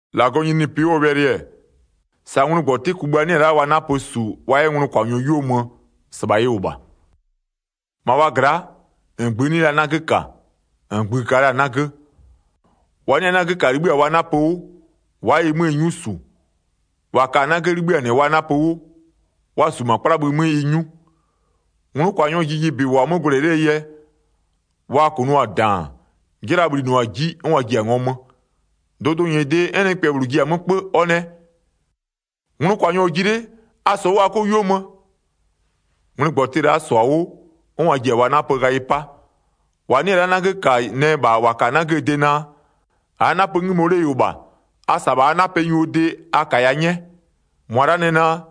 1-Lagɔɔ nyininyinipɩ 'wʋɔ wɛlɩ-ɛ, sa ngwlɩgbɔtɩ kugbïa 'nɩ-ɛ la'a wa 'napö -su wa 'yɛ nglʋkwanyɔ 'yuo mö, -sɩbha ɩ -wʋ -bha. 2-Ma wa gla'a, -ngbï 'nɩ la 'nagö -ka, -ngbï-ï ka la-a 'nagö. 3-Wa 'nɩ-a 'nagö -ka 'libhï-a wa 'napö 'wʋ, wa'a ɩ 'möö 'nyu -su. 4-Wa ka-a 'nagö 'libhï-a -nɩ wa 'napö 'wʋ, wa -su -ma 'kplabhï 'mö ɩ 'nyu. 5Nglʋkwanyɔɔ jijibɩ -wʋ-a 'mö gwlɛ 'lee yɛ, wa -kʋnʋɔ-a -daan, 'jɩla-a bhlinʋa-a -ji, 'n wa ji-a ngɔmö. 6Dʋdʋnyɩdɩ, 'n nɩkpɛ -bhlʋ ji-a 'mö 'kpö, ɔ nɛ: Nglʋkwanyɔ-ɔ ji 'le, a -sɔ 'wʋ a 'kɔ 'yuo mö. 7Ngwlɩgbɔtɩ la'a -sɔ-a 'wʋ 'n wa ji-a wa 'napö ghayɩ 'pa. 8-Wa 'nɩ-ɛ la'a 'nagö -ka nɛ -bha -wa ka-a 'nagöö de naa: -Aa 'napö 'ngïmo 'le ɩ -wʋ -bha, a -sa -bha a 'napɛnyuo de a -kaya 'nyɛ. 9-Mʋa la'a nɛ naa: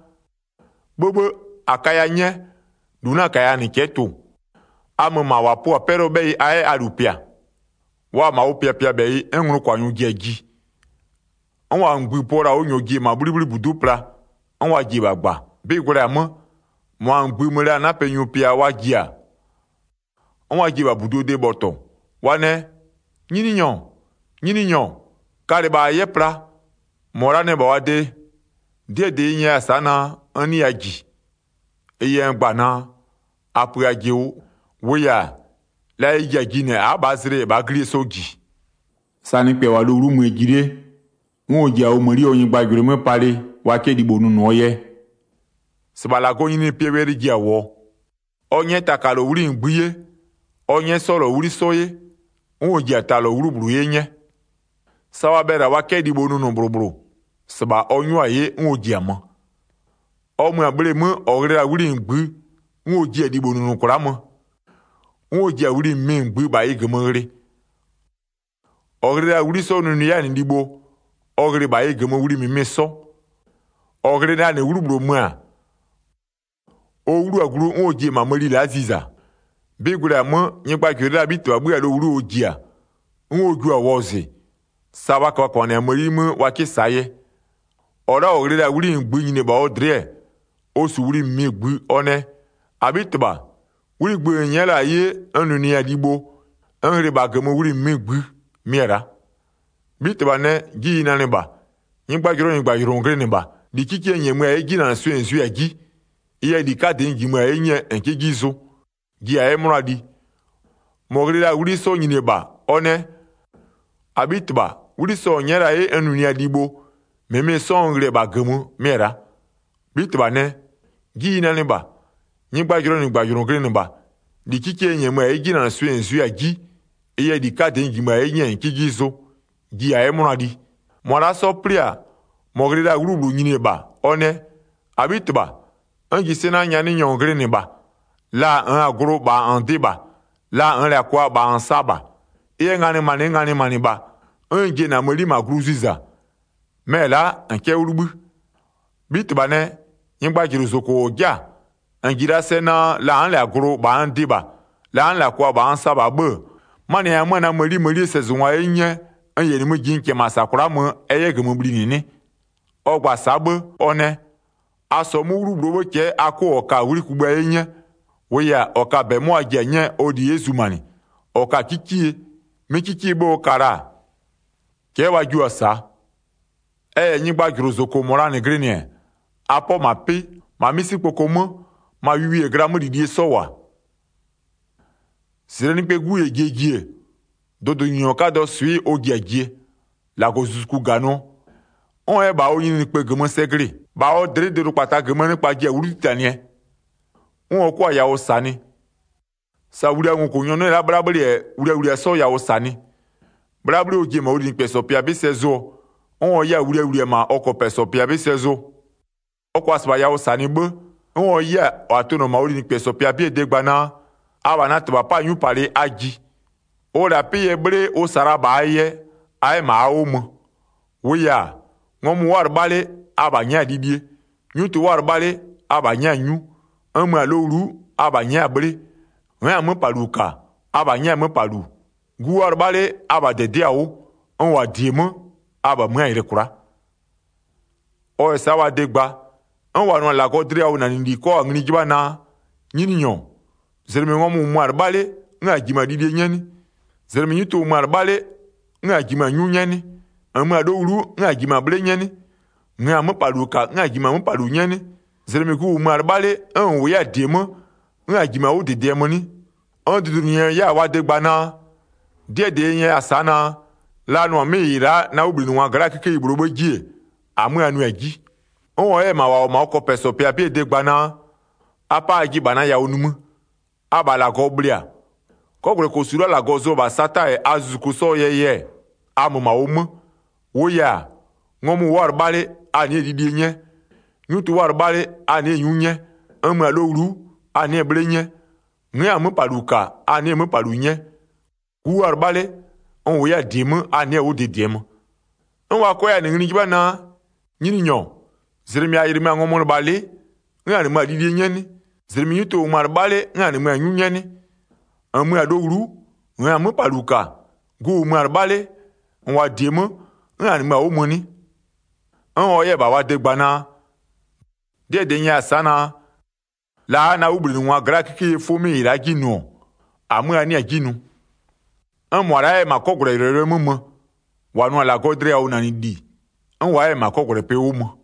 'Bhëbhë, -a kaya 'nyɛ, -lu 'na-a -kaya -nɩ cɛ'ɛ tʋ-ʋ. A mö -ma -wa pʋ-a 'pɛlʋɔ 'bhɛyɩ a 'yɛ a -lu pɩ-a. 10Wa-a -ma ʋ pɩapɩabhɛyɩ, 'n nglʋkwanyɔ ji-a ji, 'n -wa -ngbï pöɔ la-a 'wʋ -nyɔɔ ji-e -ma 'bhlibhlibudu'u pla, 'n wa ji-e -bha -gba. 11'Bɩ gwlɛ-a 'mö, -mʋa -ngbï-ï mö la-a 'napɛnyu pɩaa wa ji-a, 'n wa ji-e -bha -buduo de bhɔtɔ. Wa nɛ: Nyininyɔ, Nyininyɔ, kalɩ -bha -a 'yɛ pla. 12-Mɔ la'a nɛ -bha wa de: 'Dɩɛ -dɩ n nyɛya-a sa'a naa, n 'nɩya -ji. 13Ɩ yɛ n gba-a naa: A pö ajɩ 'wʋ, -wʋʋ yɛ-a, la ɩ ji-a jinɩɛ a'a -bhaa zlɩ -yɛ -bhaa 'glie 'sɔ -ji. Nɩkpa wa 'nyɛ-a mëni 'ye wa 'kɛ libho nʋnʋɔ 'nine 14Sa nɩkpɛ -wʋ-a lowlu'u möö ji 'le, 'n ɔ ji-a ɔ mëni ɔ nyɩgbajʋlʋɩ 'mö palɩ wa 'kɛ libho nʋnʋɔ yɛ, -sɩbha -Lagɔɔ nyininyinipɩɛ wɛlɩ ji-a -wʋɔ. 15Ɔ 'nyɛ taka -lɔ 'wli -ngbï 'ye, ɔ 'nyɛ 'sɔ -lɔ 'wli 'sɔ 'ye, 'n ɔ ji-a ta -lɔ 'wlu -bhlʋ 'ye 'nyɛ. Sa wa bhɛlɩ-a wa 'kɛ libho nʋnʋ -bhlʋ -bhlʋ, -sɩbha ɔ 'nyʋa-a 'ye 'n ɔ ji-a mö. 16Ɔ mö-a bhleemö, -ɔ ghlɩ la-a 'wli -ngbï, 'n ɔ jiɩ-a libho nʋnʋ kwla'a mö, 'n ɔ ji-a wli -mɩmɩ -ngbï -bha ɩ -gömö ghlɩ. 17-Ɔ ghlɩ la-a 'wli 'sɔ nʋnʋɩ 'yɛ-a -nɩ libho, ɔ ghlɩ -bha ɩ -gömö wli -mɩmɩ 'sɔ. 18-Ɔ ghlɩ la-a -nɩ 'wlu -bhlʋ mö-a, ɔ 'wlu-a glu 'n ɔ ji-e -ma mëni la'a ziza. 19'Bɩ gwlɛ-a 'mö, nyɩgbajʋlʋɩ la'aa 'bhitɩbha 'bhö-a lowlu'u ɔ ji-a, 'n ɔ jua-a wɔzɩ, sa wa köbhaköbhanɩ-a mëni 'mö wa 'kɩ -saa yɛ. 20-Ɔ la'a -ɔ ghlɩ la-a 'wli -ngbï nyini-e -bha ɔ dlɩ'ɩ-ɛ, ɔ -su wli -mɩmɩ -ngbï, ɔ nɛ: -Abhitɩbha 'wli -ngbï -n nyɛ'ɛ la-a 'ye n nʋnʋɩ-a libho, n ghlɩ -bha -gömö wli -mɩmɩ -ngbï mɩ-ɛ la'a. 21'Bhitɩbha nɛ: 'Ji ɩ nanɩ -bha, nyɩgbajʋlʋɔ -nyɩgbajʋlʋ -n glɩnɩ -bha. -Li 'kikie n -nyɛmö-a 'ye 'jinanɩswɩɩ -n zʋɩ-a 'ji, ɩ yɛ -li 'kadɩ n -jimö-a 'ye 'nyɛɛ -n 'kɩ 'ji zʋ. Ji -a 'yɛ 'mʋna li. 22-Mɔ ghlɩ la-a 'wli 'sɔ nyini-e -bha, ɔ nɛ: -Abhitɩbha, 'wli sɔ -n nyɛ'ɛ la-a 'ye n nʋnʋɩa-a libho -mɩmɩ 'sɔ n ghlɩ-ɛ -bha ɩ -gömö mɩ-ɛ la'a. 23'Bhitɩbha nɛ: 'Ji ɩ nanɩ -bha, nyɩgbajʋlʋɔ -nyɩgbajʋlʋ -n glɩnɩ -bha, -li 'kikie n -nyɛmö-a 'ye 'jinanɩswɩɩ -n zʋɩ-a 'ji, ɩ yɛ -li 'kadɩ n -jimö-a 'ye 'nyɛɛ -n 'kɩ 'ji zʋ. Ji -a 'yɛ 'mʋna li. 24-Mʋa la'a 'sɔ 'plɩ-a, -mɔ ghlɩ la-a 'wlu -bhlʋ nyini-e -bha, ɔ nɛ: -Abhitɩbha, n -ji sɛ naa, nyanɩnyɔ -n glɩnɩ -bha, la -nn -lɛ-a glʋ -bha -n dɩ -bha, la -nn -lɛ-a kwa -bha -n sa -bha. 25Ɩ yɛ nganɩmanɩ n nganɩmanɩ -bha, 'n n ji-e -na mëni -ma glu ziza, mɛ-ɛ la'a -n 'kɛ 'wʋ 'libhï. 26'Bhitɩbha nɛ: Nyɩgbajʋlʋ -zoko -ɔ 'ja-a, -n -ji la'a sɛ naa la n'n -lɛ-a glʋ -bha n dɩ -bha, la n'n -lɛ-a kwa -bha n sa -bha 'bhë-ë, 27'manɩɛ yɛ -nn-n 'mö-a na mëni mënie sɛzʋngwa 'ye 'nyɛ n -yɛ nimï ji n -kɛɛ -ma -sa kwla'a mö ɛ 'yɛ -gömö bhlinɩ 'nɩ? 28Ɔ gba-a sa'a 'bhë ɔ nɛ: A -sɔɔ 'mʋ 'wlu -bhlʋɔ 'bhë cɛ'ɛ a 'kʋ -ɔ ka-a -la 'wli kugbïa 'ye 'nyɛ. 29-Wʋʋ yɛ-a, -ɔ ka-a -bɛ, 'mɔ wa ji-a 'nyɛɛ ɔ -li 'yɛ zumanɩ. -Ɔ ka-a 'kikie, 'mɩ 'kikie 'bhë ɔ ka la-a, cɛ'ɛ wa jio-a -saa. 30Ɛ -yɛ nyɩgbajʋlʋ -zoko -mɔ -la glɩnɩ-ɛ, a 'pɔ -ma 'pɩ, -ma 'misikpoko 'mö, ma wiwie -yɛ glaa 'mölilie 'sɔ -wʋ-a. Sa Zezwi ji-a 'pɩnɩkpa 'bhuoo -zijle 'mö tutunʋɔ 31-Zlɩ Nɩkpɛɛ 'Gu -yɛ jie ji-e, dʋdʋnyininyɔ 'kadɔɔ swɩ'ɩ ɔ ji-a jie, -Lagɔzuzuku -ganɩɔ, 'n ɔ 'yɛ-ɛ -bha ɔ nyininyinikpë 'kada -gömö sɛ glɩ-ɩ. 32-Bha ɔ dlɩ'ɩ dʋdʋkpata -gömöö nɩkpa ji-a 'wlu 'titanɩɛ, 'n ɔ 'kʋa-a yawʋ -sanɩ, sa wliaa ngokʋnyɔ 'nɩ-ɛ la'a 'bhlabhlɩ -yɛ wliawlia 'sɔ yawʋ -sanɩ. 33'Bhlabhlɩ ɔ ji-e -ma ɔ linɩkpɛsɔ pɩa 'bɩ sɛ zʋɔ, 'n ɔ 'yɛ-a wliawlia -ma ɔ kɔpɛsɔ pɩa 'bɩ sɛ zʋ. 34Ɔ -kʋa -sɩbha yawʋ -sanɩ 'bhë, 'n ɔ 'yɛ-a -wa tʋnʋ-ɔ -ma ɔ linɩkpɛsɔ pɩa 'bɩɛ de gba naa: Abha na -Tɩbha 'pa-a 'nyupalɩ a ji, ʋ -la-a 'pɩ yɛ 'bhle ʋ -sa la-a -bha a yɛ, a 'yɛ -ma a 'wʋ mö. 35-Wʋʋ yɛ-a, ngɔmʋ wʋ'ʋ-a 'lɩbha 'le, abha nyɛ'ɛ-a lilie, 'nyutʋ wʋ'ʋ-a 'lɩbha 'le, abha nyɛ'ɛ-a 'nyu, n mö-a lowlu'u, abha nyɛ'ɛ-a 'bhle. 36N'n-a 'möpalu -ka, abha nyɛ'ɛ-a 'möpalu. Gu wʋ'ʋ-a 'lɩbha 'le, abha -dɩdɩ'ɩ-a 'wʋ, n -wʋ-a -die 'mö, abha mö'ö-a yɩlɩ kwla'a. 37Ɔ -yɛ sa'a wa de gba, 'n -wa nʋ-a -Lagɔɔ dlɩyawʋnanɩli 'kɔ-a ngli 'jɩbha naa: Nyininyɔ, -zlɩmɩ ngɔmʋ -wʋmö-a 'lɩbha 'le, 'n -a -jimö-a lilie 'nyɛ 'nɩ? -Zlɩmɩ 'nyutʋ -wʋmö-a 'lɩbha 'le, 'n -a -jimö-a 'nyu 'nyɛ 'nɩ? 38-N mö-a lowlu'u 'n -a -jimö-a 'bhle 'nyɛ 'nɩ? -Nn-a 'möpalu -ka 'n -a -jimö-a 'möpalu 'nyɛ 'nɩ? 39-Zlɩmɩ gu -wʋmö-a 'lɩbha 'le, 'n -n -wʋ 'yɛ-a -die 'mö, 'n -a jimö-a 'wʋ -dɩdɩɛ mö 'nɩ? 40'N dʋdʋnyininyɔ 'yɛ-a wa de gba naa: 'Dɩɛ -dɩ n 'nyɛya-a sa'a naa: La a nʋ-a 'mɩ -ɩ la'a na 'wʋbhlinɩngwa gla'aa 'kikeyi -bhlʋɔ 'bhë 'ji-e, -amö a nʋɩ-a 'ji. 41'N ɔ 'yɛ-ɛ -bha -wa -wʋ-ɔ -ma ɔ kɔpɛsɔ pɩa 'bɩɛ de gba naa: A 'pa ajɩ -bha na yawʋ nimï, abha -Lagɔ bhlɩ-a, 'kɔgwlɛkosu la'a -Lagɔ zʋ-ɔ -bha Sata -yɛ a zuzuku 'sɔɔ yɛ yɛ-ɛ, a mö -ma ʋ 'mö. 42-Wʋʋ yɛ-a, ngɔmʋ wʋ'ʋ-a 'lɩbha 'le a nɩ'ɩ-ɛ lilie 'nyɛ, 'nyutʋ wʋ'ʋ-a 'lɩbha 'le, a nɩ'ɩ-ɛ 'nyu 'nyɛ. 43N mö-a lowlu'u, a nɩ'ɩ-ɛ 'bhle 'nyɛ, n'n-a 'möpalu -ka a nɩ'ɩ-ɛ 'möpalu 'nyɛ, gu wʋ'ʋ-a 'lɩbha 'le, n -wʋ 'yɛ-a -die 'mö, a nɩ'ɩ-ɛ 'wʋ -dɩdɩɛ mö. 44'N wa 'kɔ 'yɛ-a -nɩ ngli 'jɩbha naa: Nyininyɔ, -zlɩmɩ -a -yɩlɩmö-a ngɔmʋlɩbhalɩ'ɩ, 'n -a -nɩmö-a lilie 'nyɛ 'nɩ? -Zlɩmɩ 'nyutʋ -wʋmö-a 'lɩbha 'le, 'n -a -nɩmö-a 'nyu 'nyɛ 'nɩ? -N mö-a lowlu'u, -nn-a 'möpalu -ka, gu -wʋmö 'yɛ-a 'lɩbha 'le, -n -wʋ-a -die 'mö, 'n -a -nɩmö-a 'wʋ mö 'nɩ? 45'N ɔ 'yɛ-ɛ -bha wa de gba naa: 'Dɩɛ -dɩ n nyɛya-a sa'a naa: La a'a-a na 'wʋbhlinɩngwaa gla'aa 'kikeyie 'fʋ 'mɩ -ɩ la'a 'ji nʋ-ɔ, -amö a 'nɩ-a 'ji nʋ. 46'N -mʋa la'a 'yɛ-ɛ -ma 'kɔgwlɛyʋlɔyʋlʋɛ 'mö mö, -wa nʋ-a -Lagɔɔ dlɩyawʋnanɩli, 'n wa 'yɛ-ɛ -ma 'kɔgwlɛpɩ 'wʋ mö.”